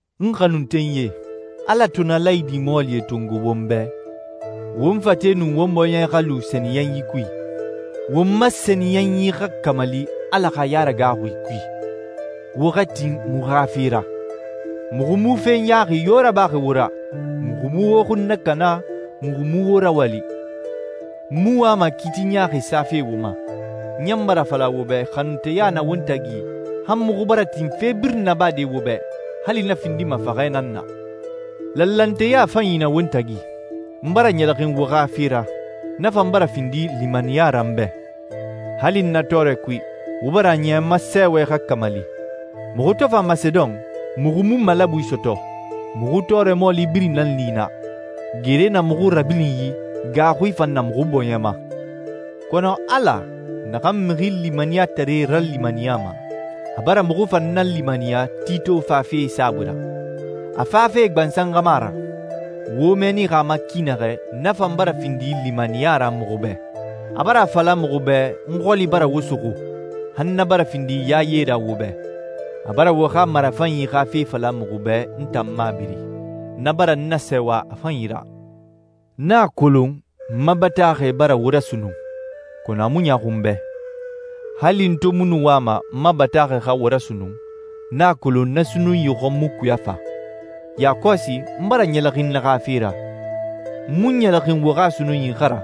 N xanuntenyie, Ala to na laayidi mɔɔlie tongo won bɛ, won fate nun won bɔɲɛ xa lu sɛniyɛnyi kui. Won ma sɛniyɛnyi xa kamali Ala xa yaragaaxui kui. Wo xa tin muxu xa fe ra. Muxu mu fe ɲaaxi yo rabaxi wo ra, muxu mu wo xun nakana, muxu mu wo rawali. N mu wama kiiti ɲaaxi safe wo ma. N ɲan bara a fala wo bɛ xanunteya na won tagi han muxu bara tin fe birin nabade wo bɛ, hali na findima faxɛ nan na. Lanlanteya fanyi na won tagi. N bara ɲɛlɛxin wo xa fe ra, na fan bara findi limaniya ra n bɛ. Hali n na tɔɔrɛ kui, wo bara a niya n ma sɛɛwɛ xa kamali. Muxu to fa Masedon, muxu mu malabui sɔtɔ, muxu tɔɔrɛ mɔɔli birin nan li naa: Gere na muxu rabilinyi, gaaxui fan na muxu bɔɲɛ ma. Kɔnɔ Ala, naxan mixi limaniyatare ralimaniyama, a bara muxu fan nalimaniya Tito fafe saabui ra. A fafe gbansan xa mu a ra. Wo mɛɛnixi a ma ki naxɛ, na fan bara findi limaniya ra muxu bɛ. A bara a fala muxu bɛ n xɔli bara wo suxu, han na bara findi yaye ra wo bɛ. A bara wo xa marafanyi xa fe fala muxu bɛ n tan mabiri. Na bara n nasɛɛwa a fanyi ra. N a kolon n ma bataaxɛ bara wo rasunnun, kɔnɔ a mu ɲaaxu n bɛ. Hali n to mu nu wama n ma bataaxɛ xa wo rasunnun, n a kolon na sunnunyi xɔn mu kuya fa. Yakɔsi n bara ɲɛlɛxin na xa fe ra. N mu ɲɛlɛxin wo xa sunnunyi xa ra,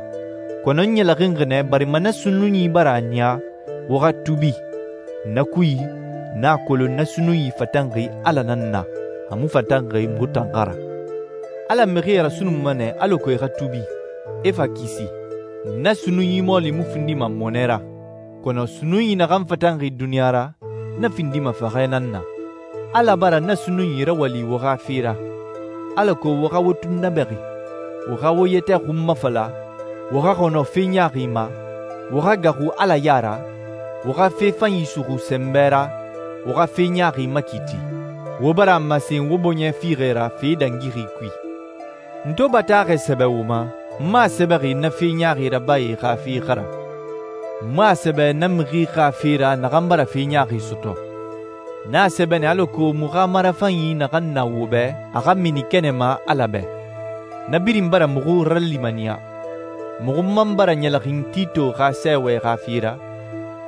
kɔnɔ n ɲɛlɛxinxi nɛ barima na sunnunyi bara a niya wo xa tuubi. Na kui, n a kolon na sunnunyi fatanxi Ala nan na, a mu fatanxi muxu tan xa ra. Ala mixie rasunnunma nɛ alako e xa tuubi, e fa kisi. Na sunnunyi mɔɔli mu findima mɔnɛ ra, kɔnɔ sunnunyi naxan fatanxi duniɲa ra, na findima faxɛ nan na. Ala bara na sunnunyi rawali wo xa fe ra, alako wo xa wo tunnabɛxi, wo xa wo yɛtɛ xunmafala, wo xa xɔnɔ fe ɲaaxi ma, wo xa gaaxu Ala ya ra, wo xa fe fanyi suxu sɛnbɛ ra, wo xa fe ɲaaxi makiiti. Wo bara a masen wo bɔɲɛ fiixɛ ra fe dangixi kui. N to bataaxɛ sɛbɛ wo ma, n mu a sɛbɛxi na fe ɲaaxi rabae xa fe xa ra, n mu a sɛbɛ na mixi xa fe ra naxan bara fe ɲaaxi sɔtɔ. N a sɛbɛ nɛ alako muxu xa marafanyi naxan na wo bɛ a xa mini kɛnɛ ma Ala bɛ. Na birin bara muxu ralimaniya. Muxu man bara ɲɛlɛxin Tito xa sɛɛwɛ xa fe ra,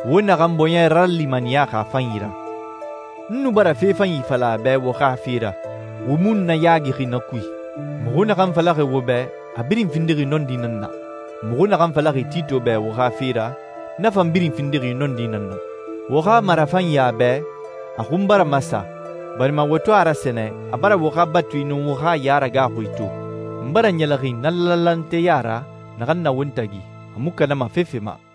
wo naxan bɔɲɛ ralimaniyaxi a fanyi ra. N nu bara fe fanyi fala a bɛ wo xa fe ra. Wo mu n nayaagixi na kui. Muxu naxan falaxi wo bɛ, a birin findixi nɔndi nan na. Muxu naxan falaxi Tito bɛ wo xa fe ra, na fan birin findixi nɔndi nan na. Wo xa marafanyi a bɛ, a xun bara masa, barima wo to a rasɛnɛ, a bara wo xa batui nun wo xa yaragaaxui to. N bara ɲɛlɛxin na lanlanteya ra naxan na won tagi, a mu kanama fefe ma.